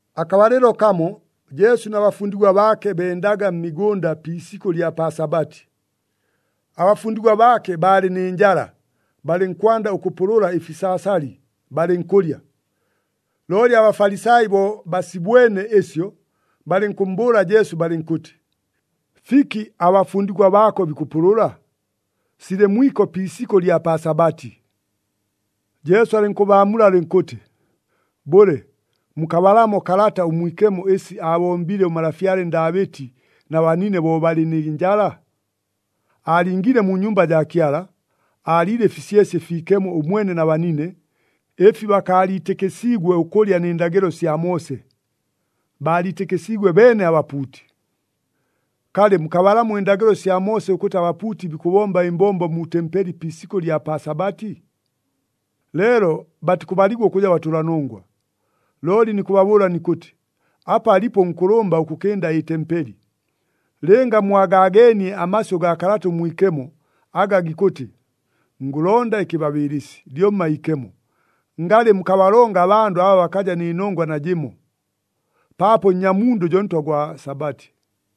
Akabalɨlo kamo, Jesu na bafundigwa baake bendaga mmigʉnda pi isikʉ ɨlya pa Sabati. Abafundigwa baake baalɨ nɨ njala, balɨnkwanda ʉkʉpʉlʉla ɨfisaasali, balɨnkʉlya. Looli aBafalisai bo basibwene ɨsyo, balɨnkʉmmbʉʉla Jesu balɨnkʉtɨ, “Fiki, abafundigwa baako bikʉpʉlʉla? Silɨ mwiko pi isikʉ ɨlya pa Sabati!” Jesu alɨnkʉbaamula alɨnkʉtɨ, “Bʉle, mukabalamo Kalata ʉMwikemo ɨsi aabombile ʉmalafyale Ndaabɨti na banine bo balɨ nɨ njala? Aalingiile mu nyumba jaa Kyala, aaliile ɨfisyesye ɨfiikemo ʉmwene na banine, ɨfi bakaaliitɨkɨsiigwe ʉkʉlya nɨ ndagɨlo sya Moose. Baaliitɨkɨsiigwe beene abapuuti. Kalɨ, mukabalamo ɨndagɨlo sya Moose ʉkʉtɨ abapuuti bikʉbomba ɨmbombo mu tempeli pi isikʉ ɨlya pa Sabati? Leelo batikʉbaligwa ʉkʉja batʉlanongwa. Looli nikʉbabʉʉla nikʉtɨ, apa alipo ʉnkʉlʉmba ʉkʉkɨnda ɨtempeli. Lɨnga mwagaageenie amasyʉ gaa Kalata ʉMwikemo, aga gikʉtɨ, ‘Ngʉlonda ɨkɨbabɨɨlɨsi, lyomma iikemo,’ ngalɨ mukabalonga abandʉ aba bakaja nɨ nongwa najɨmo. Paapo Nnyamundʉ jo Ntwa gwa Sabati.”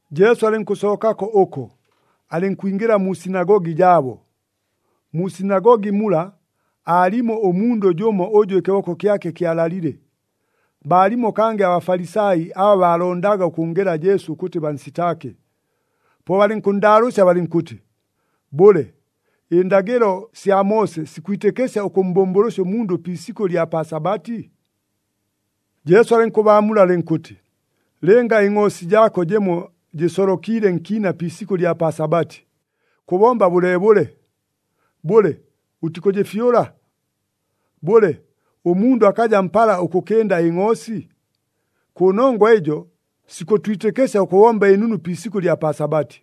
Jesu alɨnkʉsookako ʉko, alɨnkwingɨla mu sinagogi jaabo. Mu sinagogi mula, aalimo ʉmundʉ jʉmo ʉjʉ ɨkɨboko kyake kyalalile. Baalimo kangɨ aBafalisai aba baalondaga ʉkʉnngela Jesu ʉkʉtɨ bansitaake, po balɨnkʉnndaalʉʉsya balɨnkʉtɨ, “Bʉle, ɨndagɨlo sya Moose sikwitɨkɨsya ʉkʉmmbʉmbʉlʉsya ʉmundʉ pi isikʉ ɨlya pa Sabati?” Jesu alɨnkʉbaamula alɨnkʉtɨ, “Lɨnga ɨngʼoosi jaako jɨmo jɨsolokiile nkiina pi isikʉ ɨlya pa Sabati, kʉbomba bʉleebʉle? Bʉle, ʉtikʉjɨfyʉla? Bʉle, ʉmundʉ akaja mpala ʉkʉkɨnda ɨngʼoosi? Kʉnongwa ɨjo sikʉtwitɨkɨsya ʉkʉbomba ɨnunu pi isikʉ ɨlya pa Sabati.”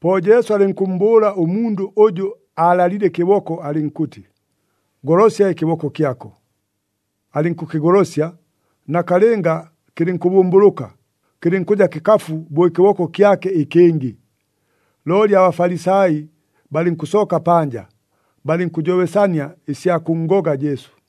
Po Jesu alɨnkʉmmbʉʉla ʉmundʉ ʉjʉ aalalile ɨkɨboko alɨnkʉtɨ, “Golosya ɨkɨboko kyako.” Alɨnkʉkɨgolosya, nakalɨnga kɨlɨnkʉbʉmbʉlʉka, kɨlɨnkʉja kɨkafu bo ɨkɨboko kyake ɨkɨngɨ. Looli aBafalisai balɨnkʉsooka panja, balɨnkʉjobesania ɨsya kʉnngoga Jesu.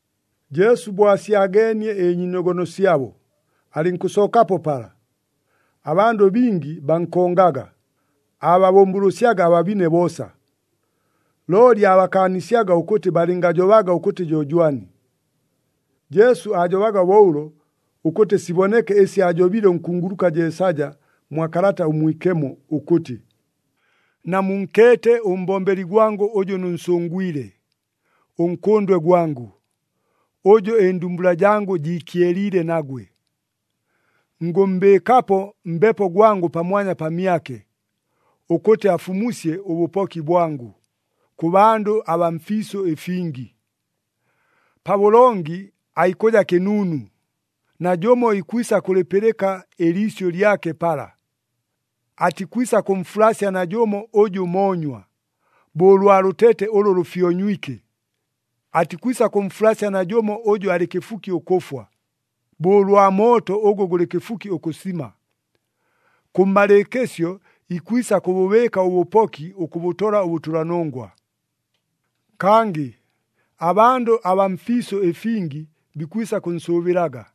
Jesu bo asyageenie ɨnyiinogono syabo, alɨnkʉsookapo pala. Abandʉ bingi bankongaga, aababʉmbʉlʉsyaga ababine boosa. Looli aabakaanisyaga ʉkʉtɨ balɨngajobaga ʉkʉtɨ jo jwani. Jesu aajobaga bo ʉlo, ʉkʉtɨ siboneke ɨsi aajobile ʉnkunguluka Jeesaja mwa Kalata ʉMwikemo ʉkʉtɨ, “Namunkeete ʉmbombeli gwangʉ ʉjʉ nʉnsʉngwile, ʉNkʉndwe gwangʉ, ʉjʉ ɨndumbula jangʉ jiikyeliile nagwe. Ngʉmmbɨɨkapo Mbepo gwangʉ pamwanya pamyake, ʉkʉtɨ afumusye ʉbʉpoki bwangʉ kʉ bandʉ abaa mfiisʉ ɨfingi. Pabʉlongi aikʉja kɨnuunu, Najʉmo ikwisa kʉlɨpɨlɨka ɨliisyʉ lyake pala. Atikwisa kʉmfulasya najʉmo ʉjʉ moonywa, bo ʉlwa lʉtete ʉlʉ lʉfyonywike. Atikwisa kʉmfulasya najʉmo ʉjʉ alɨ kɨfuki ʉkʉfwa, bo ʉlwa mooto ʉgʉ gʉlɨ kɨfuki ʉkʉsima. Kʉmmalɨɨkɨsyo ikwisa kʉbʉbɨɨka ʉbʉpoki ʉkʉbʉtola ʉbʉtʉlanongwa. Kangɨ abandʉ abaa mfiisʉ ɨfingi bikwisa kʉnsʉʉbɨlaga.”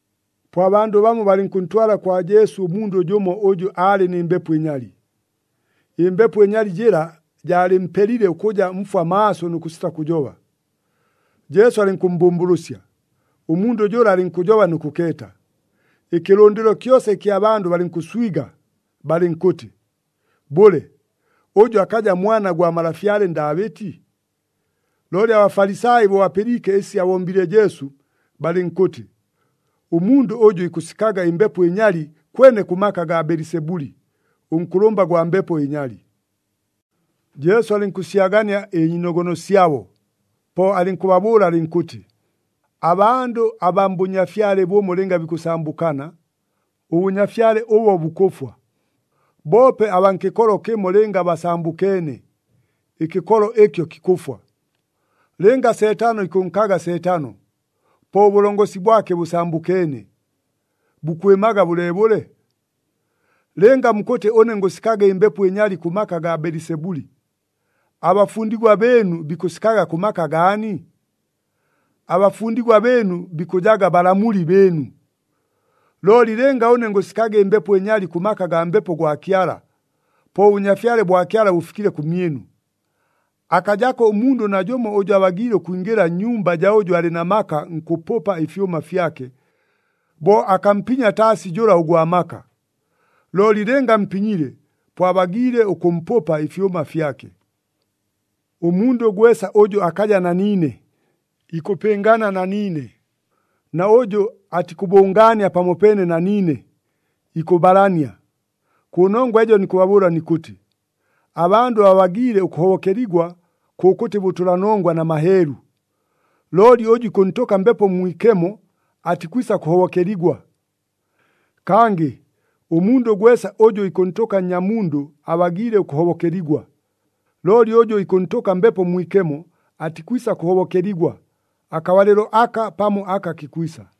Po abandʉ bamo balɨnkʉntwala kwa Jesu ʉmundʉ jʉmo ʉjʉ aalɨ nɨ mbepo ɨnyali. Ɨmbepo ɨnyali jɨla jaalɨmpelile ʉkʉja mfwa maaso nʉ kʉsita kʉjoba. Jesu alɨnkʉmmbʉmbʉlʉsya, ʉmundʉ jʉla alɨnkʉjoba nʉ kʉkeeta. Ɨkɨlʉndɨlo kyosa ɨkya bandʉ balɨnkʉswiga, balɨnkʉtɨ, “Bʉle, ʉjʉ akaja Mwana gwa malafyale Ndaabɨti?” Looli aBafalisai bo bapɨliike ɨsi abombile Jesu, balɨnkʉtɨ, “Ʉmundʉ ʉjʉ ikʉsikaga ɨmbepo ɨnyali kwene kʉ maka agaa Belisebuli, ʉnkʉlʉmba gwa mbepo ɨnyali.” Jesu alɨnkʉsyagania ɨnyiinogono syabo, po alɨnkʉbabʉʉla alɨnkʉtɨ, “Abandʉ abaa mbʉnyafyale bʉmo, lɨnga bikʉsambʉkana, ʉbʉnyafyale ʉbo bukʉfwa. Boope abaa nkɨkolo kɨmo, lɨnga basambʉkeene, ɨkɨkolo ɨkyo kikʉfwa. Lɨnga Seetano ikʉnkaga Seetano, po ʉbʉlongosi bwake bʉsambʉkeene. Bukwɨmaga bʉleebʉle? Lɨnga mukʉtɨ ʉne ngʉsikaga ɨmbepo ɨnyali kʉ maka agaa Belisebuli, abafundigwa bɨɨnu bikʉsikaga kʉ maka gaani? Abafundigwa bɨɨnu bikʉjaga balamuli bɨɨnu. Looli lɨnga ʉne ngʉsikaga ɨmbepo ɨnyali kʉ maka agaa Mbepo gwa Kyala, po ʉBʉnyafyale bwa Kyala bʉfikile kʉmyɨnu! Akajako ʉmundʉ najʉmo ʉjʉ abagiile ʉkwingɨla nnyumba jaa ʉjʉ alɨ na maka nkʉpʉpa ɨfyʉma fyake, bo akampinya taasi jʉla ʉgwa maka. Looli lɨnga ampinyile, po abagiile ʉkʉmpʉpa ɨfyʉma fyake. “Ʉmundʉ gwesa ʉjʉ akaja na niine, ikʉpɨngana na niine, na ʉjʉ atikʉbʉngaania pamopeene na niine, ikʉbalania. Kʉnongwa ɨjo nikʉbabʉʉla nikʉtɨ, abandʉ babagiile ʉkʉhobokeligwa kʉkʉtɨ bʉtʉlanongwa na maheelu. Looli ʉjʉ ikʉntʉka Mbepo Mwikemo, atikwisa kʉhobokeligwa. Kangɨ ʉmundʉ gwesa ʉjʉ ikʉntʉka Nnyamundʉ abagiile ʉkʉhobokeligwa. Looli ʉjʉ ikʉntʉka Mbepo Mwikemo, atikwisa kʉhobokeligwa, akabalɨlo aka pamo aka kikwisa.”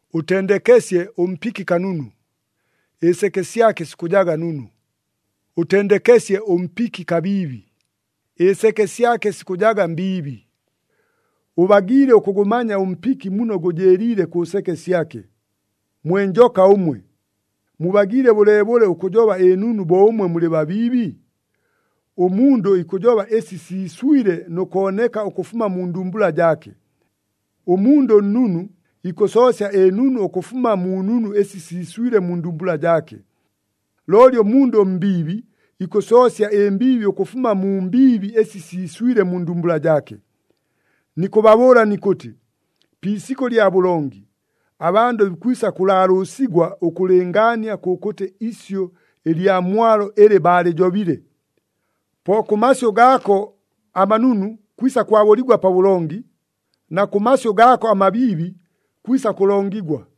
“Ʉtendekesye ʉmpiki kanunu, ɨseke syake sikʉjaga nunu. Ʉtendekesye ʉmpiki kabiibi, ɨseke syake sikʉjaga mbiibi. Ʉbagiile ʉkʉgʉmanya ʉmpiki muno gʉjɨɨliile kʉ seke syake. Mwe njoka ʉmwe! Mubagiile bʉleebʉle ʉkʉjoba ɨnunu bo ʉmwe mulɨ babiibi? Ʉmundʉ ikʉjoba ɨsi siiswile nʉ kooneka ʉkʉfuma mu ndumbula jaake. Ʉmundʉ ʉnnunu ikʉsoosya ɨnunu ʉkʉfuma mu nunu ɨsi siiswile mu ndumbula jaake. Looli ʉmundʉ ʉmbiibi, ikʉsoosya ɨmbiibi ʉkʉfuma mu mbiibi ɨsi siiswile mu ndumbula jaake. Nikʉbabʉʉla nikʉtɨ, pi isikʉ lya bʉlongi, abandʉ bikwisa kʉlaalʉʉsigwa ʉkʉlɨngaania kʉkʉtɨ isyʉ ɨlya mwalo ɨlɨ baalɨjobile. Po kʉ masyʉ gaako amanunu kwisa kwabʉligwa pabʉlongi, na kʉ masyʉ gaako amabiibi kwisa kʉlongigwa.”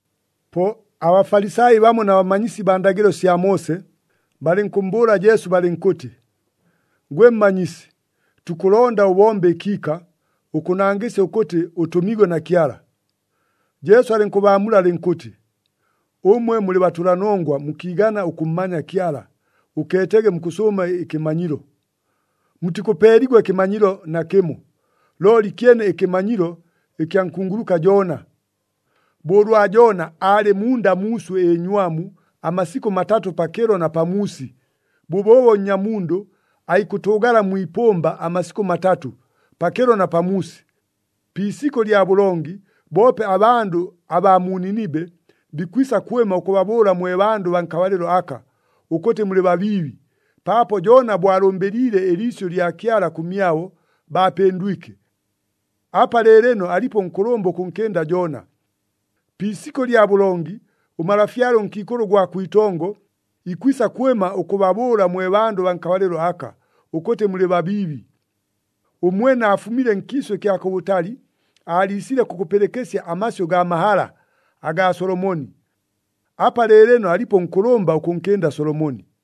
Po aBafalisai bamo na bamanyisi baa ndagɨlo sya Moose, balɨnkʉmmbʉʉla Jesu balɨnkʉtɨ, “Gwe Mmanyisi, tukʉlonda ʉbombe ɨkiika, ʉkʉnangɨsya ʉkʉtɨ ʉtʉmiigwe na Kyala.” Jesu alɨnkʉbaamula alɨnkʉtɨ, “Ʉmwe mulɨ batʉlanongwa mukiigana ʉkʉmmanya Kyala, ʉkeetege mukʉsʉʉma ɨkɨmanyilo! Mutikʉpeeligwa ɨkɨmanyilo nakɨmo, looli kyene ɨkɨmanyilo ɨkya nkunguluka Joona. Bo ʉlwa Joona aalɨ munda muuswɨ ɨnywamu amasikʉ matatʉ, pakɨlo na pamuusi, bʉbʉʉbo Nnyamundʉ aikʉtʉʉgala mwi ipʉmba amasikʉ matatʉ, pakɨlo na pamuusi. Pi isikʉ lya bʉlongi, boope abandʉ abaa mu Ninibe bikwisa kwɨma ʉkʉbabʉʉla mwe bandʉ baa nkabalɨlo aka, ʉkʉtɨ mulɨ babiibi, paapo Joona bo alʉmbɨliile ɨliisyʉ lya Kyala kʉmyabo, baapɨndwike. Apa lɨɨlɨno alipo ʉnkʉlʉmba ʉkʉnkɨnda Joona! Pi isikʉ lya bʉlongi, ʉmalafyale ʉnkiikʉlʉ ʉgwa kwitongo ikwisa kwɨma ʉkʉbabʉʉla mwe bandʉ baa nkabalɨlo aka, ʉkʉtɨ mulɨ babiibi. Ʉmwene aafumile nkiisʉ kya kʉbʉtali, aaliisile kʉkʉpɨlɨkɨsya amasyʉ gaa mahala agaa Solomoni. Apa lɨɨlɨno alipo ʉnkʉlʉmba ʉkʉnkɨnda Solomoni!”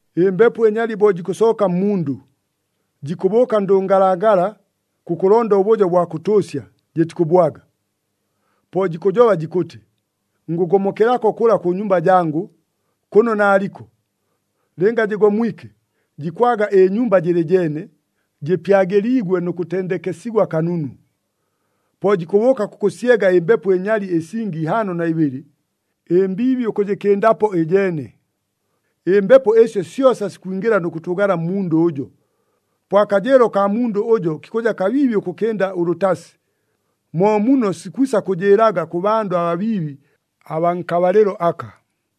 “Ɨmbepo ɨnyali bo jikʉsooka mmundʉ, jikʉbʉʉka ndʉngalangala kʉkʉlonda ʉbʉjo bwa kʉtʉʉsya, jɨtikʉbwaga. Po jikʉjoba jikʉtɨ, ‘Ngʉgomokelako kʉla kʉ nyumba jangʉ, kʉno naaliko.’ Lɨnga jɨgomwike, jikwaga ɨnyumba jɨlɨ jeene, jɨpyagɨliigwe nʉ kʉtendekesigwa kanunu. Po jikʉbʉʉka kʉkʉsyega ɨmbepo ɨnyali ɨsingi ihaano na ibɨlɨ, ɨmbiibi ʉkʉjɨkɨndapo ɨjeene. Ɨmbepo ɨsyo syosa sikwingɨla nʉ kʉtʉʉgala mmundʉ ʉjo. Po akajɨɨlo kaa mundʉ ʉjo kikʉja kabiibi ʉkʉkɨnda ʉlʉtasi. Mo muno sikwisa kʉjɨɨlaga kʉ bandʉ ababiibi abaa nkabalɨlo aka.”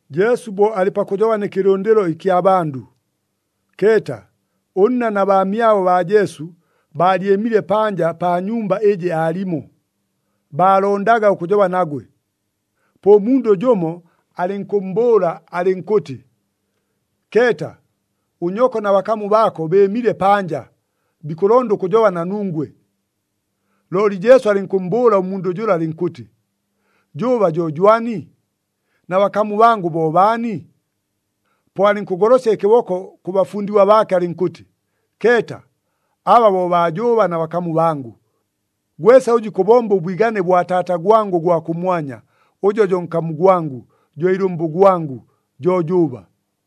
Jesu bo alɨ pakʉjoba nɨ kɨlʉndɨlo ɨkya bandʉ, keeta, ʉnna na baamyabo baa Jesu baalyɨmile panja pa nyumba ɨjɨ aalimo, baalondaga ʉkʉjoba nagwe. Po ʉmundʉ jʉmo alɨnkʉmmbʉʉla alɨnkʉtɨ, “Keeta! Ʉnyoko na bakamu baako bɨɨmile panja, bikʉlonda ʉkʉjoba na nungwe.” Looli Jesu alɨnkʉmmbʉʉla ʉmundʉ jʉla alɨnkʉtɨ, “Jʉʉba jo jwani? Na bakamu bangʉ bo baani?” Po alɨnkʉgolosya ɨkɨboko kʉ bafundigwa baake alɨnkʉtɨ, “Keeta, aba bo baa jʉʉba na bakamu bangʉ! Gwesa ʉjʉ ikʉbomba ʉbwigane bwa Taata gwangʉ ʉgwa kʉmwanya, ʉjo jo nkamu gwangʉ, jo ilʉmbʉ gwangʉ, jo jʉʉba.”